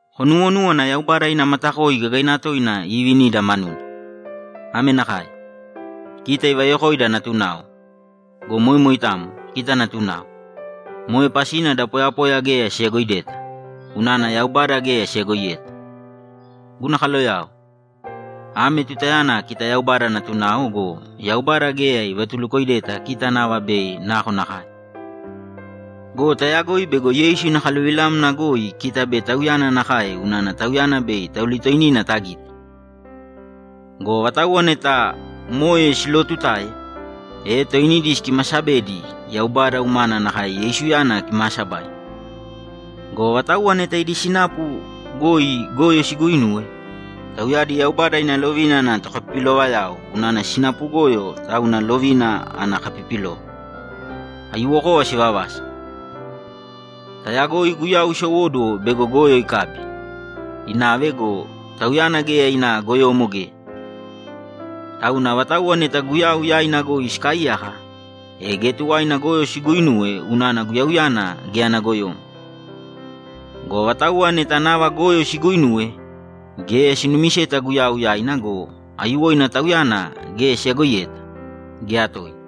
Konuwonūwana Yaubada ina matakoi gagaina toina iivinida manuna! Ame nakae: Kita ivayokoida natunao! Go moe moitamo, kita natunao! Moe pasina da poyapoya geya siyagoideta, unana Yaubada geya siyagoiyeta. Guna kaloyao, ame tutayana kita Yaubada natunao go, Yaubada geya ivatulukoideta kita nava bei nakonakae. Go tayagoi bego Yeisu ina kaluvilamna goi kita bei Tauyana nakae unana Tauyana bei taulitoinina tagite. Go avatauwa neta moe silootutae, toinidi sikimaasabedi Yaubada umana nakae Yeisuyana kimaasabaina. Go avatauwa neta idi sinapu goi goyo siguuinuwe, tauyadi Yaubada ina lovina ana tokapipilovayao unana sinapu goyo tauna lovina ana kapipilova; aiyuwokova sivavasa. Tayagoi Guyau isowóduwo bego goyo ikabi, inave go, Tauyana geya ina goyomo geya. Tauna avatauwa neta Guyau yaina goi sikaaiyaka, e geya tuwaina goyo siguuinuwe unana Guyauyana geya ana goyomo. Go avatauwa neta nava goyo siguuinuwe, geya sinumiseta Guyau yaina go, aiyuwoina Tauyana geya siyagoiyeta, geya toina.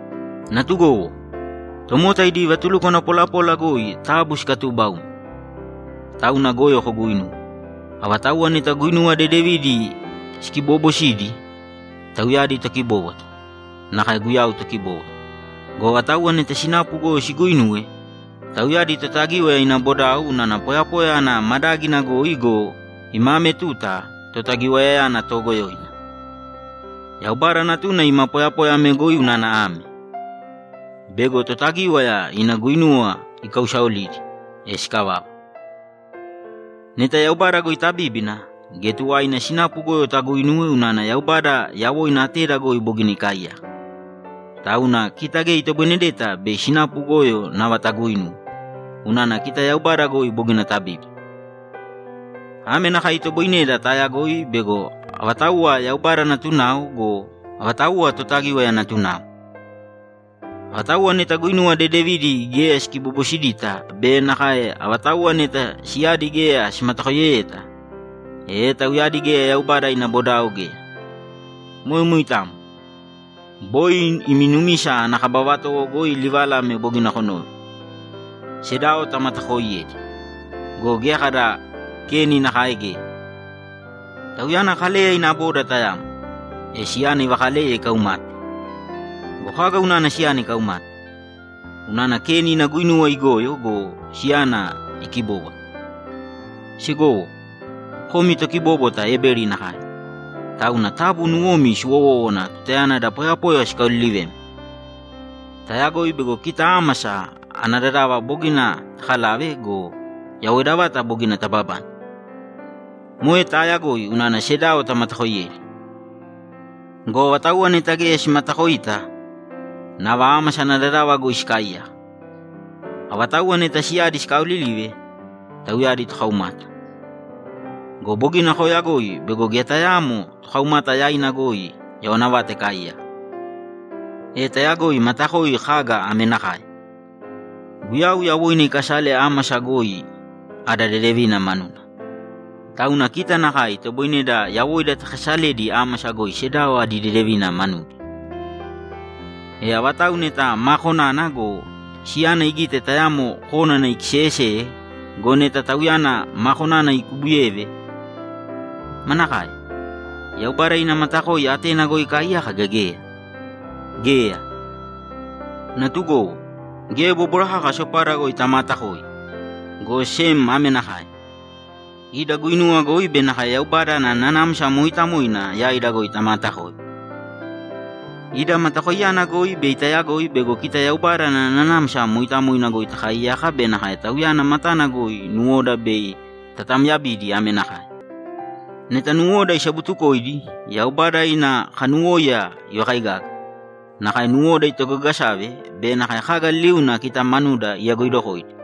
Natugowo, tomota idi vatulukwana polapola goi taabu sikatuubaūmi, tauna goyo koguuinuwe. Avatauwa neta guinuwa dedevidi sikiboobosidi, tauyadi tokibóbwata, nakae Guyau Tokibóbwata. Go avatauwa neta sinapu goyo siguuinuwe, tauyadi Totagíwaya ina bodao unana poyapoya ana madágina goi go, ima ame tuta Totagiwayayana toogoyoina. Yaubada Natuna ima poyapoya ame goi unana ame: Bego Totagíwaya ina guinuwa ikausaolidi, e sikavava. Neta Yaubada goi tabíbina, geya tuwaina sinapu goyo taguuinuwe unana Yaubada yawoina ateda goi bogina ikaaiyaka. Tauna kita geya itoboinedeta bei sinapu goyo nava taguuinuwe, unana kita Yaubada goi bogina tabíbina. Ame nakae itoboineda taayagoi bego avatauwa Yaubada natunao go, avatauwa Totagíwaya natunao: Avatauwa neta guinuwa dedevidi geya sikibobosidita be nakae avatauwa neta siyadi geya simatakoiyeyeta, e tauyadi geya Yaubada ina bodao geya. Moe moitamo. Boi imi numisa ana kaba vatowo goi livala ame bogina konove: Sedao tamatakooiyēdi. Go geya kada Keni nakae geya. Tauyana Kaleya ina boda tayamo, e siyana ivakaleye ikaumate. Go kaga unana siyana ikaumate? Unana Keni ina guinuwa igoyo go, siyana ikibóbwata. Segowo, komi tokibóbwata Ebeli nakae, tauna taabu nuwomi siwowōwana tutayana da poyapoya sikaolilivemi. Tayagoi bego kita ámasa ana dadava bogina takalave go, yawoida vata bogina tababane. Moe taayagoi unana sedao tamatakoiyedi. Go avatauwa neta geya simatakoita, nava ámasa ana dadava goi sikaaiyaka. Avatauwa neta siyadi sikaaolilive, tauyadi tokaumata. Go bogina kooyagoi bego geya tayaamo tokaumata yaina goi yawana vata ikaaiyaka. E tayagoi matakoi kaga ame nakae: Guyau yawoina ikasale ámasa goi ada dedevina manuna. Tauna kita nakae itoboineda yawoida takasaledi ámasa goi sedao adi dedevina manudi. E avatau neta maa konana go, siyana igite tayamo kónana ikiseyeseye go, neta tauyana maa konana ikubuyeve, manakae? Yaubada ina matakoi atena goi ikaaiyaka gea geya? Geya! Natugowo, geya bóbwara kaka sopada goi tamaatakoi, go sem ame nakae: Ida guinuwa goi be nakae Yaubada ana Nanamsa Mooitamoina yaida goi tamaatakōi. Ida matakoiyana goi bei tayagoi bego kita Yaubada ana Nanamsa Mooitamoina goi takaaiyaka be nakae Tauyana matana goi nuwoda bei tatamyabidi ame nakae: Neta nuwoda isabutukoidi, Yaubada ina kanuwóiya ivakaigaga, nakae nuwoda itogagasave be nakae kaga liliuna kita manuda iyagoidokoidi,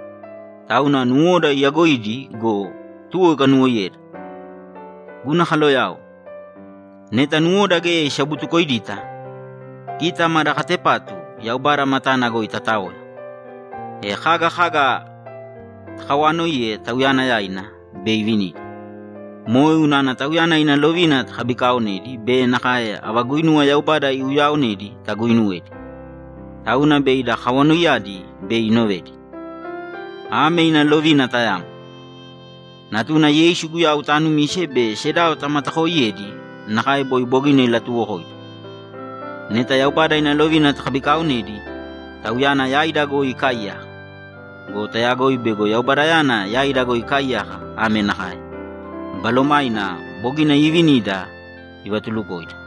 tauna nuwoda iyagoidi go, tuwo ikanuwoiyeda. Guna kaloyao, neta nuwoda geya isabutukoidita, kita mada katepatu Yaubada matana goi tataoya, e kaga kaga takawaanoiye Tauyana yaina, bei ivinida. Moe unana Tauyana ina lovina takabikaaonedi be nakae ava guinuwava Yaubada iuyaaonedi taguuinuwedi. Tauna bei ida kawanoiyadi bei inovedi. Ame ina lovina tayamo: Natuna Yeisu Guyau taanumīse be sedao tamatakooiyēdi nakae boi bogina ilatuuwokoida. Neta Yaubada ina lovina takabikaaonedi, Tauyana yaida goi ikaaiyaka. Go tayagoi bego Yaubadayana yaida goi ikaaiyaka ame nakae: Balomaina bogina iivinida ivatulukoida.